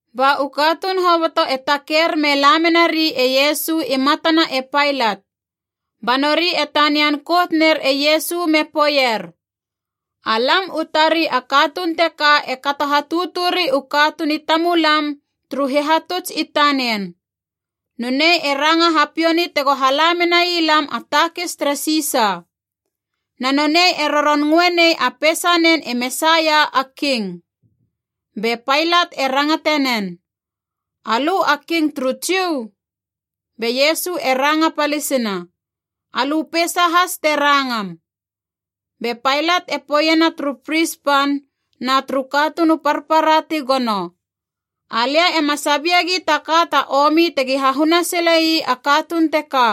Ba u katuun hoboto e taker me la menari e Iesu i matana e Pailat. Ba nori e tanian kout ner e Iesu me poeier, “Alam u tari a katuun teka e kato hatuturi u katuun i tamulam turu hihatuts i tanen. Nonei e ranga hapiouni tego hala menai lam a takis tere Sisa. Na nonei e roron ngöe nei a peisanen e Mesaia, a king.” Be Pailat e rangate nen, “Alö a King turu Jiu?” Be Iesu e ranga palisina, “Alö peisa has te rangam.” Be Pailat e poeiena turu pris pan na turu katuun u parpara ti gono, “Alia ema sabiegi ta ka ta omi tegi hahuna sile ii a katuun teka.”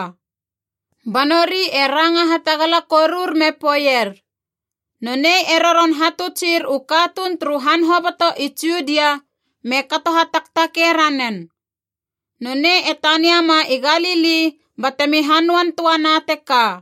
Ba nori e ranga hatagala korur me poeier, “Nonei e roron hatutsir u katuun turu han hoboto i Judia me kato hataktakei ranen. Nonei e taniama i Galili batemi hanöan töa na teka.”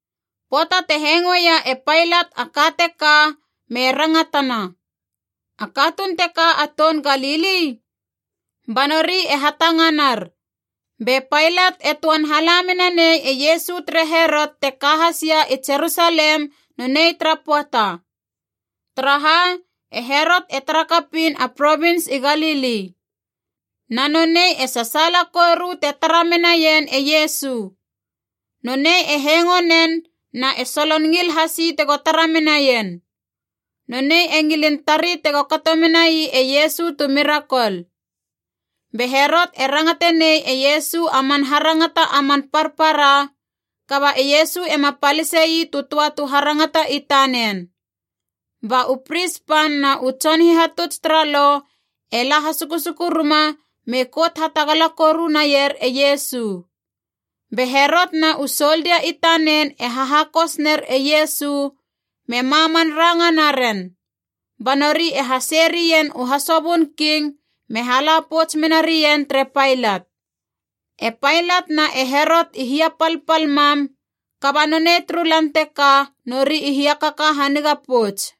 Pöata te hengoeia e Pailat a ka teka me rangatana, “A katuun teka a toun Galili?” Ba nori e hatanganar, be Pailat e töan hala mena nei e Iesu tere Herot te ka hasia i Jerusalem nonei tara pöata. Taraha? E Herot e tara kapiin a provins i Galili. Na nonei e sasaala koru te tara menaien e Iesu. Nonei e hengo nen na e solon ngil hasi tego tara menaien. Nonei e ngilin tari tega kato menai e Iesu tu mirakol. Be Herot e rangate nei e Iesu a man harangata a man parpara, kaba e Iesu ema palise ii tu töa tu harangata i tanen. Ba u pris pan na u tson hihatuts tara Lo e la hasusuku ruma me kout hatagala koru naier e Iesu. Be Herot na u soldia i tanen e hahakos ner e Iesu me maman ranga naren. Ba nori e hasei rien u hasobön king me hala pouts mena rien tere Pailat. E Pailat na e Herot i hiapalpal mam, kaba nonei turu lan teka nori i hiakaka haniga pouts.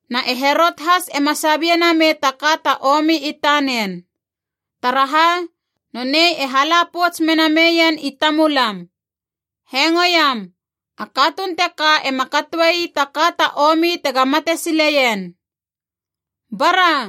Na e Herot has ema sabie namei ta ka ta omi i tanen. Taraha? Nonei e hala pouts mena meien i tamulam. Hengoiam, a katuun teka ema katoe ii ta ka ta omi tega mate sileien. Bara,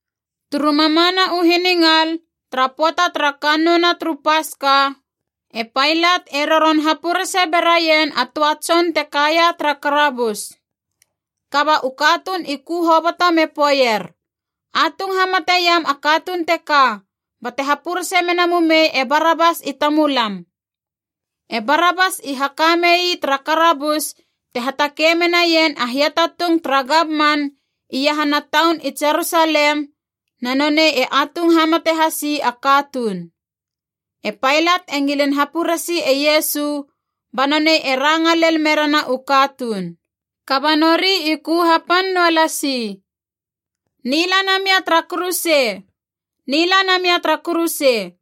Turu mamana u hiningal tara pöata tara Kannouna turu Paska, e Pailat e roron hapurese beraien a töa tson te kaia tara karabus.) Kaba u katuun i ku hoboto me poeier, “Atung hamateiam a katuun teka, bate hapurese mena mumei e Barabas i tamulam!” (E Barabas i haka mei tara karabus te hatakei menaien a hiatatung tara gamman iahana taun i Jerusalem, na nonei e atung hamate hasi a katuun.) E Pailat e ngilin hapuresi e Iesu, ba nonei e ranga lel merena u katuun. Kaba nori i ku hapan noa lasi, “Nila namia tara kuruse! Nila namia tara kuruse!”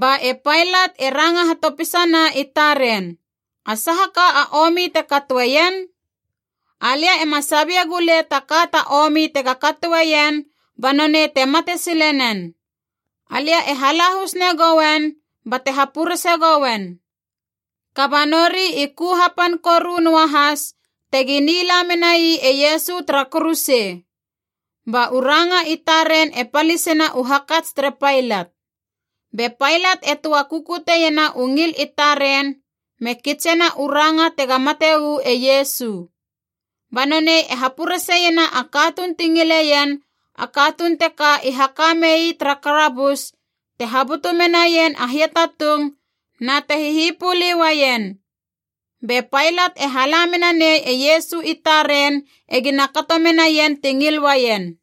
Ba e Pailat e ranga hatopisana i taren, “A saha ka a omi te katoeien? Alia ema sabie gulei ta ka ta omi tega katoeien ba nonei te mate sile nen! Alia e halahus negoen bate hapurese gouen.” Kaba nori i ku hapan koru noa has tegi nila menai e Iesu tara kuruse. Ba u ranga i taren e palisena u hakats tere Pailat. Be Pailat e töa kukutiena u ngil i taren me kitsena u ranga tega mate uu e Iesu. Ba nonei e hapureseiena a katuun ti ngileien, a katuun teka i haka mei tara karabus te habutu menaien a hiatatung na te hihipuli uaien. Be Pailat e hala mena nei e Iesu i taren egina kato menaien ti ngil uaien.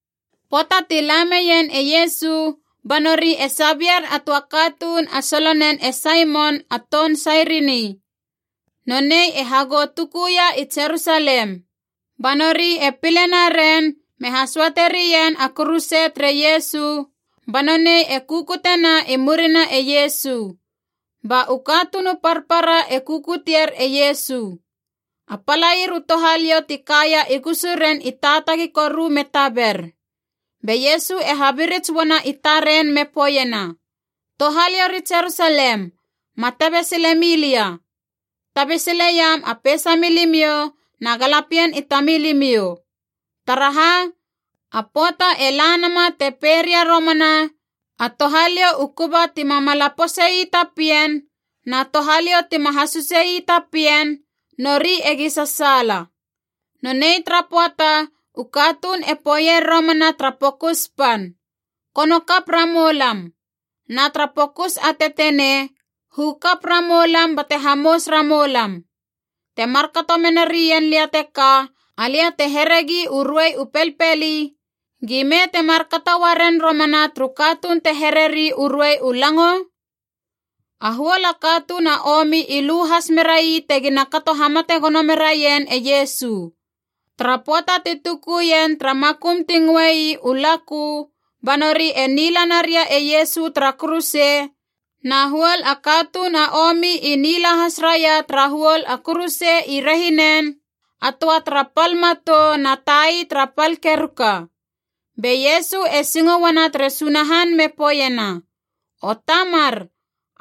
Pöata ti la meien e Iesu, ba nori e sabier a töa katuun a solonen e Saimon, a toun Sairini. Nonei e hagou tukuia i Jerusalem. Ba nori e pile naren me hasöate rien a kuruse tere Iesu, ba nonei e kukutena i murina e Iesu. Ba u katuun u parpara e kukutier e Iesu. A palair u touhaliou ti kaia i gusuren i taatagi koru me taber. Be Iesu e habirits uana i taren me poeiena, “Touhaliou ri Jerusalem, ma tabe sile milia. Tabe sileiam a peisa milimiou na galapien i tamilimiou. Taraha? A pöata e la nama te pei ria romana, ‘A touhaliou u kuba ti mamala pose ii ta pien na touhaliou tima hasuse ii ta pien, nori egi sasaala!’ Nonei tara pöata u katuun e poeier romana tara pokus pan, ‘Kono kap ramoulam,’ na tara pokus a tetenei, ‘Hu kap ramoulam bate hamous ramoulam!’ Te markato mena rien lia teka, alia te heregi u ruei u pelpeli, gime te markato uaren romana turu katuun te hereri u ruei u lango?” A huol a katuun a omi i lu has merai tegina kato hamate gono meraien e Iesu. Tara pöata ti tukuien tara makum ti ngöe ii U Lakö, ba nori e nila naria e Iesu tara kuruse, na huol katuun a omi i nila has raia tara huol a kuruse i rehinen, a töa tara pal matou na tai tara pal keruka. Be Iesu e singo uana tere Sunahan me poeiena, “O Tamar,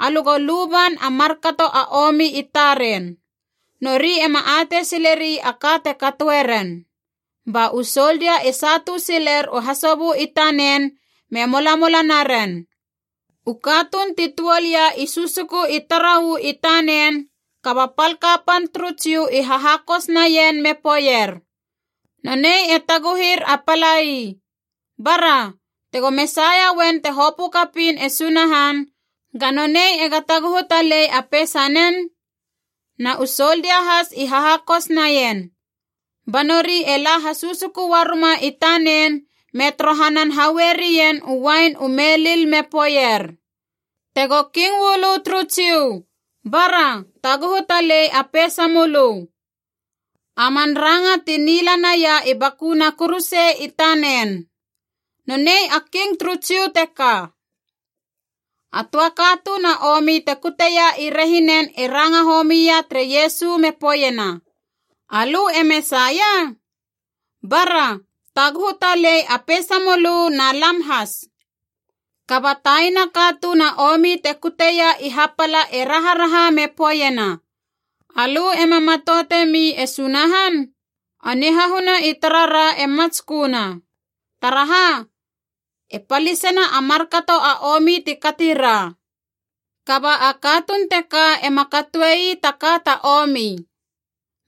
alö go luban a markato a omi i taren. Nori ema atei sileri a ka te katoe ren.” Ba u soldia e satu siler u hasobö i tanen, me molamola naren. U katuun ti tuol ia i susuku i tara uu i tanen, kaba pal kapan turu Jiu i hahakos naien me poeier, “Nonei e taguhir a palai. Bara, tego Mesaia uen te hopö kapiin e Sunahan, ga nonei ega taguhu talei a peisanen!” Na u soldia has i hahakos naien. Ba nori e la hasusuku uaruma i tanen me torohanan haue rien u uain u melil me poeier, “Tego King uu lö turu Jiu, bara, taguhu talei a peisamölö!” A man ranga ti nila naia i bakuna kuruse i tanen, Nonei a King turu Jiu teka. A töa katuun a omi te kuteia i rehinen e ranga homia tere Iesu me poeiena, “Alö e Mesaia? Bara, taguhu talei a peisamölö na lam has!” Kaba taina katuun a omi te kuteia i hapala e raharaha me poeiena, “Alö ema matoutemi e Sunahan? A nihahuna i tarara e matsköna. Taraha? E palisena a markato a omi ti kati ra. Kaba a katuun teka ema katoe ii ta ka ta omi.”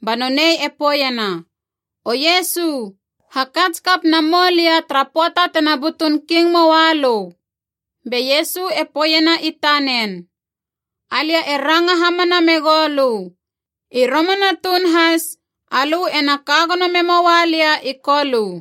Ba nonei e poeiena, “O Iesu, hakats kap namoulia tara pöata tena butun King moa lö!” Be Iesu e poeiena i tanen, “Alia e ranga hamana megou lö, i romana tuun has, alö ena ka gono memoua lia i Kolö.”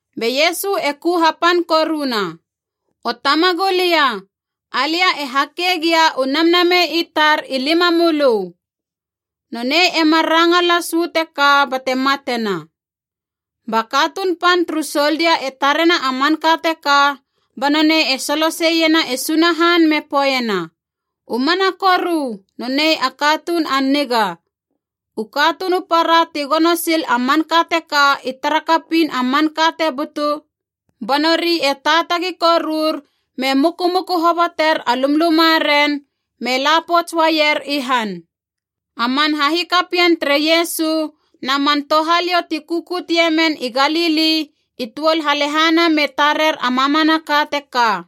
Be Iesu e ku hapan koruna, “O Tamagulia! Alia e hake gia u namnamei i tar i limamölö!” Nonei e mar ranga las uu teka bate matena. Ba katuun pan turu soldia e tarena a manka teka, ba nonei e soloseiena e Sunahan me poeiena, “U mana koru, nonei a katuun a niga!” U katuun u para ti gono sil a manka teka i tara kapiin a manka te butu, ba nori e taatagi korur me mukumuku hoboter a lumlumaren me la pouts uaier i han. A man hahikapien tere Iesu na man touhaliou ti kukutie men i Galili i tuol halehana me tarer a mamanaka teka.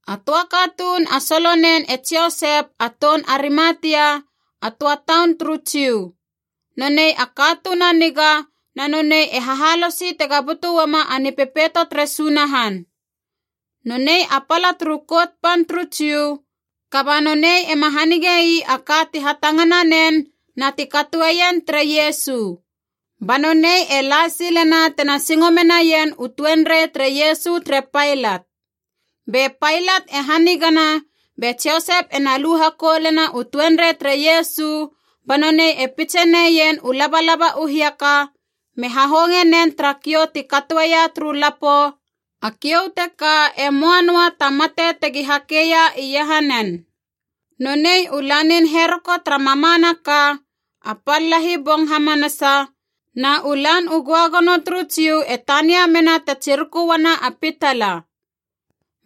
A töa katuun a solonen e Josep a toun Arimatia, a töa taun turu Jiu. Nonei a katuun a niga, na nonei e hahalosi tega butu uama a Nipepeito tere Sunahan. Nonei a pala turu Kout Pan turu Jiu, kaba nonei ema hanige ii a ka ti hatangana nen na ti katoeien tere Iesu. Ba nonei e la silena tena singo menaien u tuenrei tere Iesu tere Pailat. Be Pailat e hanigana, be Josep ena lu hakoulena u tuenrei tere Iesu, ba nonei e pitse neien u labalaba u hiaka, me hahonge nen tara kiou ti katoeia turu lapo, a kiou teka e möa noa ta mate tegi hakeia iahanen. Nonei u lanin heroko tara mamanaka, a pal lahi bong hamanasa, na u Lan u Göagono turu Jiu e tania mena te tsiruku uana a pitala.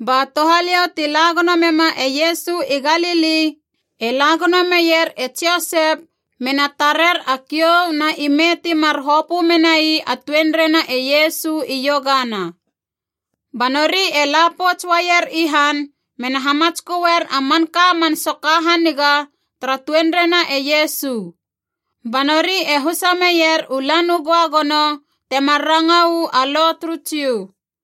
Ba touhaliou ti la gono mema e Iesu i Galili e la gono meier e Josep mena tarer a kiou na ime timar hopö menai a tuenreina e Iesu iogana. Ba nori e la pouts uaier i han mena hamatsköer a manka man soka haniga tara tuenreina e Iesu. Ba nori e husa meier u Lan u Göagono, temar ranga uu a Lo turu Jiu.